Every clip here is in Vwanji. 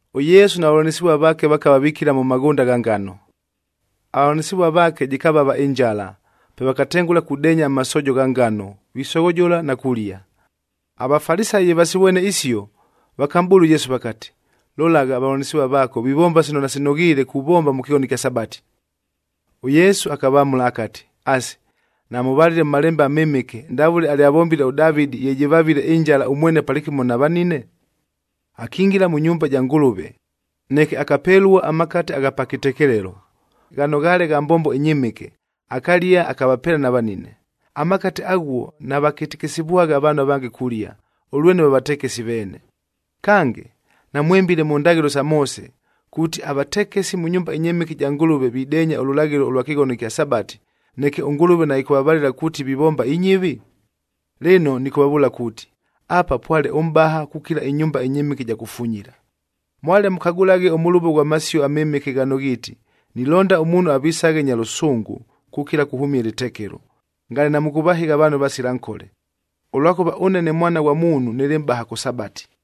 ʉYesu na vavʉlanɨsɨvua vaake vakava vikila mʉ maghʉnda gha ngano. Avavʉlanɨsɨvua vaake jɨkavava ɨnjala, pe vakatengʉla kudeenya amasoojo gha ngano, visoghojola na kulia. AVafalisayi ye vasivwene isio, vakamʼbʉʉla ʉYesu vakati, “Lolagha, avavʉlanɨsɨvua vaako vivomba sino nasinoghiile kuvomba mʉ kɨghono ɨkya Sabati!” ɄYesu akavamʉla akati, “Asi, namʉvalile mʉ Malembe aMɨmɨke, ndavʉle alyavombile ʉDavɨdib ye jɨvavile ɨnjala ʉmwene palɨkɨmo na vanine? Akingila mʉ nyumba ja Ngʉlʉve, neke akapelua amakate agha pa kɨtekelelo, ghano ghaale gha mbombo ɨnyɨmɨke, akalia akavapeela na vanine. Amakate aghuo navakɨtɨkɨsɨvwagha avaanhu avange kulia, ʉlwene va vatekesi veene. Kange, namwɨmbile mʉ ndaghɨlo sa Moose, kuuti avatekesi mʉ nyumba ɨnyɨmɨke ɨja Ngʉlʉve videenya ʉlʉlaghɨlo ʉlwa kɨghono ɨkya Sabati, neke ʉNgʉlʉve naɨkʉvavalɨla kuuti vivomba inyɨvi? Lɨno nɨkʉvavʉʉla kuuti, apa pwale ʉmʼbaha kukila ɨnyumba ɨnyɨmɨke ɨja kufunyila. Mwale mʉkagʉlaghe ʉmʉlʉvo ghwa Masio aMɨmɨke ghano ghiiti, ‘Nilonda ʉmuunhu avisaghe nya lʉsʉngʉ kukila kuhʉmia ɨlɨtekelo,’c ngale namʉkʉvahɨgha avaanhu avasila nkole. Ʉlwakʉva ʉne ne Mwana ghwa Muunhu nɨlɨ Mʼbaha kʉ Sabati.”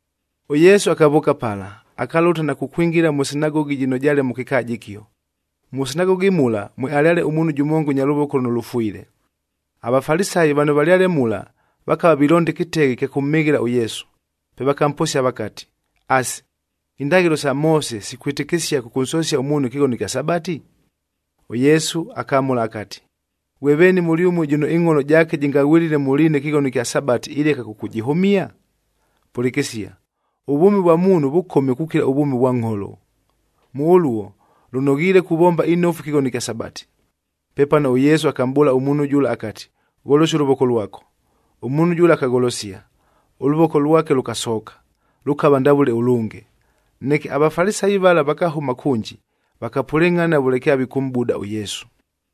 ɄYesu akavʉʉka pala, akalʉta na kukwingila mʉ sinagogi jɨno jaale mʉ kɨkaaja ɨkio. Mʉ sinagogi mula, mwealyale ʉmuunhu jʉmonga ʉnya lʉvoko lʉno lʉfwile. AVafalisayi vano valyale mula vakava vilonda ɨkɨteghe ɨkya kʉmhɨghɨla ʉYesu, pe vakamposia vakati, “Asi, indaghɨlo isa Moose sikwɨtɨkɨsia kʉkʉnsosia ʉmuunhu ɨkɨghono ɨkya Sabati?” ɄYesu akamʉla akati, “Ghwe veeni mʉlyʉmue jʉno ɨngʼholo jaake jɨngaghwɨlɨle mʉ liina ɨkɨghono ɨkya Sabati ileka kʉkʉjɨhʉmia? Pʉlɨkɨsia, ʉvwʉmi vwa muunhu vʉkome kukila ʉvwʉmi vwa ngʼholo. Mʉ ʉluo, lʉnoghiile kuvomba inofu ɨkɨghono ɨkya Sabati.” Pepano ʉYesu akamʼbʉʉla ʉmuunhu jʉla akati, “Gholosia ʉlʉvoko lwako.” Ʉmuunhu jʉla akagholosia, ʉlʉvoko lwake lʉkasooka, lʉkava ndavʉle ʉlʉnge. Neke aVafalisayi vala vakahʉma kʉnji, vakapʉlɨngʼhana vʉle kyavikʉmʼbuda ʉYesu.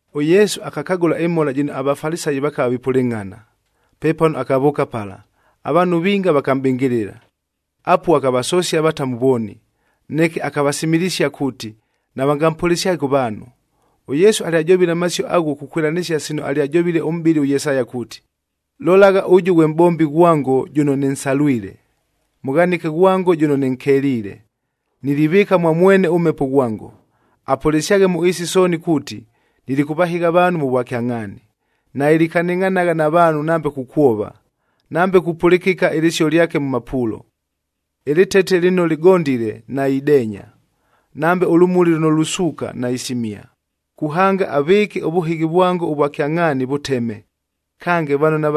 ɄYesu akakagʉla ɨmhola jɨno aVafalisayi vakava vipʉlɨngʼhana. Pepano akavʉʉka pala, avaanhu vinga vakamʼbɨngɨlɨla. Apuo akavasosia avatamu vooni. Neke akavasimilisia kuuti navangampʉlɨsyaghe kʉ vaanhu. ɄYesu alyajovile amasio aghuo kukwɨlanɨsia sino alyajovile ʉmʼbɨli ʉYesaya kuuti, “Lolagha, ʉjʉ ghwe mʼbombi ghwango jʉno nɨnsalwile, Mʉghanɨke ghwango jʉno nɨnkeliile. Nilivɨɨka mwa mwene ʉMhepo ghwango, apʉlɨsyaghe mʉ ɨɨsi sooni kuuti, nilikʉvahɨgha avaanhu mʉ vwakyangʼhaani. Nailikanɨngʼhanagha na vaanhu nambe kukwova, nambe kupʉlɨkɨka ɨlɨsio lyake mʉ mapuulo. Ɨlɨtete lɨno lɨgondile, naideenya,d nambe ʉlʉmuli lʉno lusuuka, naisimia, kuhanga avɨɨke ʉvʉhɨghi vwango ʉvwa kyangʼhaani vʉteme. Kange,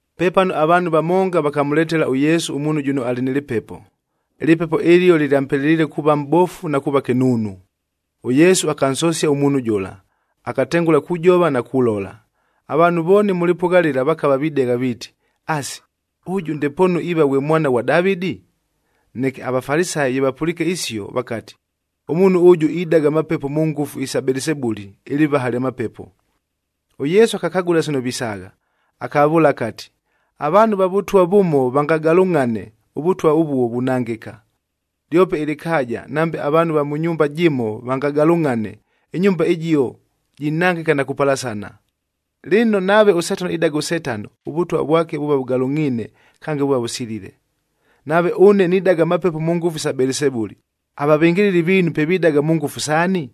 Pepano avaanhu vamonga vakamʉletela ʉYesu ʉmuunhu jʉno alɨ nɨ lɨpepo. Ɨlɨpepo ɨlio lɨlyampeleliile kuuva mʼbofu na kuuva kɨnuunu. ɄYesu akansosia ʉmuunhu jʉla, akatengʉla kujova na kulola. Avaanhu vooni mʉ lɨpʉgha lɨla vakava videgha viiti, “Asi, ʉjʉ ndepoonu iiva ghwe Mwana ghwa Davɨdi?” Neke aVafalisayi ye vapʉliike isio, vakati, “Ʉmuunhu ʉjʉ idaga amapepo mʉ ngʉfu isa Belisebuli, ɨlɨvaha lya mapepo!” ɄYesu akakagʉla sino visaagha, akavavʉʉla akati, “Avaanhu va vʉtwa vʉmo vangagalʉngʼhane, ʉvʉtwa ʉvuo vunangɨka. Lyope ɨlɨkaaja nambe avaanhu va mʉ nyumba jɨmo vangagalʉngʼhane, ɨnyumba ɨjio jinangɨka na kupalasana. Lɨno, nave ʉSetano idaga ʉSetano, ʉvʉtwa vwake vuuva vʉgalʉngʼhiine, kange vuuva vʉsilile. Nave ʉne nidaga amapepo mʉ ngʉfu sa Belisebuli, avavɨngɨlɨli viinu pe vidaga mʉ ngʉfu saani?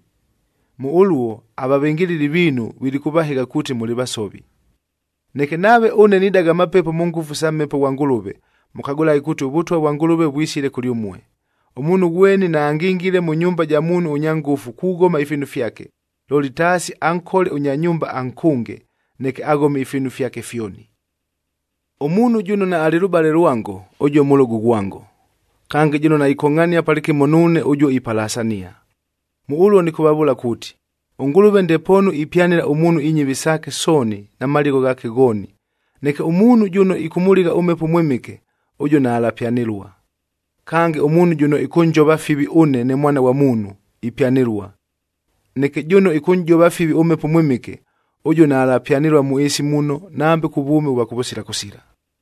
Mʉ ʉluo, avavɨngɨlɨli viinu vilikʉvahɨgha kuuti mʉlɨ vasovi. Neke nave ʉne nidaga amapepo mʉ ngʉfu sa Mhepo ghwa Ngʉlʉve, mʉkagʉlaghe kuuti ʉVʉtwa vwa Ngʉlʉve vwisile kʉlyʉmue. Ʉmuunhu ghweni naangingile mʉ nyumba ja muunhu ʉnya ngʉfu kughoma ifiinu fyake, looli taasi ankole ʉnya nyumba ankʉnge, neke aghome ifiinu fyake fyoni. “Ʉmuunhu jʉno naalɨ lʉbale lwango, ʉjuo mʉlʉgʉ ghwango. Kange, jʉno naikongʼhania palɨkɨmo nuune, ʉjuo ipalasania. Mʉ ʉluo nɨkʉvavʉʉla kuuti, ʉNgʉlʉve ndepoonu ipyanɨla ʉmuunhu inyɨvi saake sooni na maligho ghaake ghooni, neke ʉmuunhu jʉno ɨkʉmʉligha ʉMhepo ʉMwɨmɨke, ʉjuo naalapyanɨlua. Kange, ʉmuunhu jʉno ɨkʉnjova fivi ʉne ne Mwana ghwa Muunhu, ipyanɨlua. Neke, jʉno ɨkʉnʼjova fivi ʉMhepo ʉMwɨmɨke, ʉjuo naalapyanɨlua mʉ ɨɨsi muno nambe kʉ vwʉmi ʉvwa kʉvʉsila kʉsila.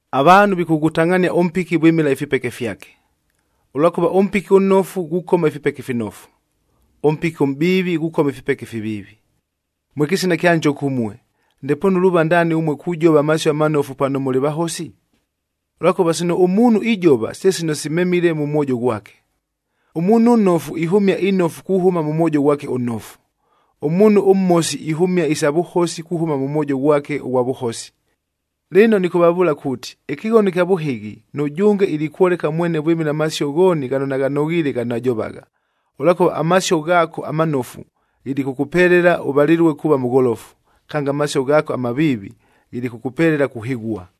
“Avaanhu vikʉghʉtangʼhania ʉmpiki vwɨmɨla ifipeke fyake. Ʉlwakʉva ʉmpiki ʉnnofu ghukoma ifipeke ifinofu, ʉmpiki ʉmʼbiivi ghukoma ifipeke ifiviivi. Mwe kɨsina kya njoka ʉmue! Ndepoonu luuva ndaani ʉmue kujova amasio amanofu pano mʉlɨ vahosi? Ʉlwakʉva sino ʉmuunhu ijova, se sino simemile mʉ mwojo ghwake. Ʉmuunhu ʉnnofu ihʉmia inofu kuhʉma mʉ mwojo ghwake ʉnnofu. Ʉmuunhu ʉmhosi ihʉmia isa vʉhosi kuhʉma mʉ mwojo ghwake ʉghwa vʉhosi. Lɨno nɨkʉvavʉʉla kuuti, ɨkɨghono ɨkya vʉhɨghi, nʉjʉnge ilikwoleka mwene vwɨmɨla amasio ghooni ghano naghanoghiile, ghano ajovagha. Ʉlwakʉva amasio ghaako amanofu ghilikʉkʉpelela ʉvalɨlue kuuva mʉgholofu, kange amasio ghaako amaviivi ghilikʉkʉpelela kuhɨghua.”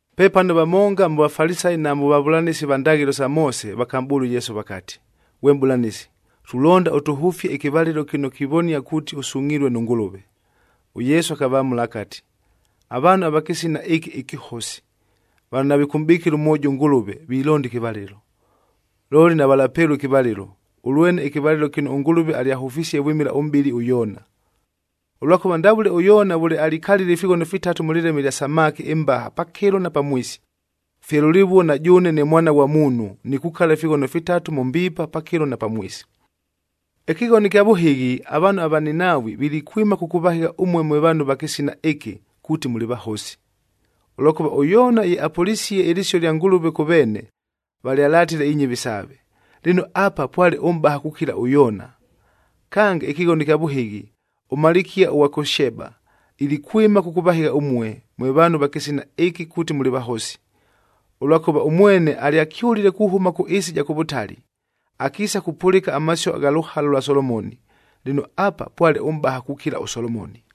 Pepano vamonga mʉ Vafalisayi na mʉ vavʉlanɨsi va ndaghɨlo isa Moose vakamʼbʉʉla ʉYesu vakati, “Ghwe Mʼbʉlanɨsi, tulonda ʉtʉhʉfie ɨkɨvalɨlo kɨno kivonia kuuti ʉsungʼhilue nʉ Ngʉlʉve.” ɄYesu akavamʉla akati, “Avaanhu va kɨsina ɨkɨ ɨkɨhosi, vano navikʉmʼbɨkɨla mwojo ʉNgʉlʉve vilonda ɨkɨvalɨlo! Looli navalapelua ɨkɨvalɨlo, ʉlwene ɨkɨvalɨlo kɨno ʉNgʉlʉve alyahʉfisie vwɨmɨla ʉmʼbɨli ʉYoona. Ʉlwakʉva ndavʉle ʉYoona vʉle alikalile ifighono fitatu mʉ lɨleme lya samaki ɨmbaha pakɨlo na pamwisi,f fye lʉlɨvuo na jʉʉne ne Mwana ghwa Muunhu, nikukala ifighono fitatu mʉ mbiipa, pakɨlo na pamwisi. “Ɨkɨghono ɨkya vʉhɨghi, avaanhu ava Ninaawi, vilikwɨma kʉkʉvahɨgha ʉmue mwe vaanhu va kɨsina ɨkɨ kuuti mʉlɨ vahosi. Ʉlwakʉva ʉYoona ye apʉlisie ɨlɨsio ɨlya Ngʉlʉve kʉ veene, valyalatile inyɨvi saave. Lɨno, apa pwale ʉmʼbaha kukila ʉYoona! Kange, ɨkɨghono ɨkya vʉhɨghi, ʉmalikia ʉghwa kʉ Sheba ilikwɨma kʉkʉvahɨgha ʉmue, mwe vaanhu va kɨsina ɨkɨ kuuti mʉlɨ vahosi. Ʉlwakʉva ʉmwene alyakyʉlile kuhʉma kʉ ɨɨsi ɨja kʉ vʉtali, akiisa kupʉlɨka amasio gha lʉhala lwa Solomoni. Lɨno, apa pwale ʉmʼbaha kukila ʉSolomoni.”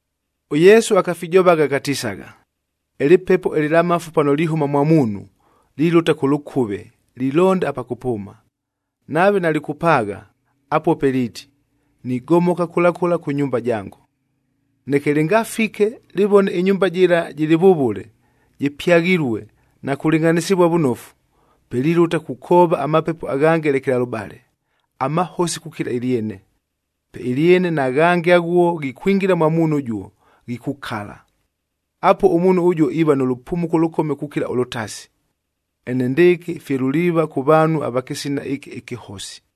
ɄYesu akafijovagha akatisagha, “Ɨlɨpepo ɨlɨlamafu pano lihʉma mwa muunhu, lilʉta kʉ lʉkʉve lilonda apa kʉpʉʉma. Nave nalɨkʉpaagha, apuo pe liiti, ‘Nigomoka kʉla kʉla kʉ nyumba jango.’ Neke lɨngafike, lɨvone ɨnyumba jɨla jɨlɨ vʉvʉle, jɨpyaghilue, na kulɨngʼhanɨsɨvua vʉnofu, pe lilʉta kukoova amapepo aghange lekelalʉbale, amahosi kukila ɨlyene. Pe ɨlyene na ghange aghuo ghikwingila mwa muunhu ʉjuo, ghikukala. Apuo ʉmuunhu ʉjuo iiva nʉ lʉpumuko ʉlʉkome kukila ʉlʉtasi. Enendɨɨkɨ fye luliiva kʉ vaanhu ava kɨsina ɨkɨ ɨkɨhosi.”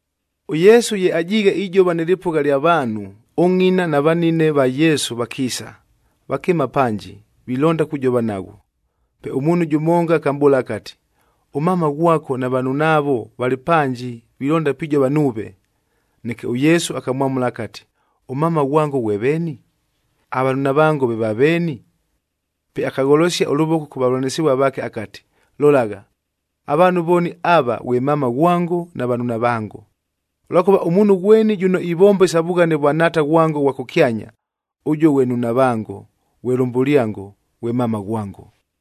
ɄYesu ye ajiighe ijova nɨ lɨpʉgha lya vaanhu, ʉngʼina na vanine va Yesu vakiisa, vakɨɨma panji, vilonda kujova naghwo. Pe ʉmuunhu jʉmonga akamʼbʉʉla akati, “Ʉmama ghwako na vanunaavo valɨ panji, vilonda pijova nuuve.” Neke ʉYesu akamwamʉla akati, “Ʉmama ghwango ghwe veeni? Avanunavango ve vaveeni?” Pe akagholosia ʉlʉvoko kʉ vavʉlanɨsɨvua vaake akati, “Lolagha, avaanhu vooni ava ghwe mama ghwango, na vanunavango. Ʉlwakʉva ʉmuunhu ghweni jʉno ivomba isa vughane vwa Nhaata ghwango ʉghwa kʉkyanya, ʉjuo ghwe nnunavango, ghwe lʉmbʉlyango, ghwe mama ghwango.”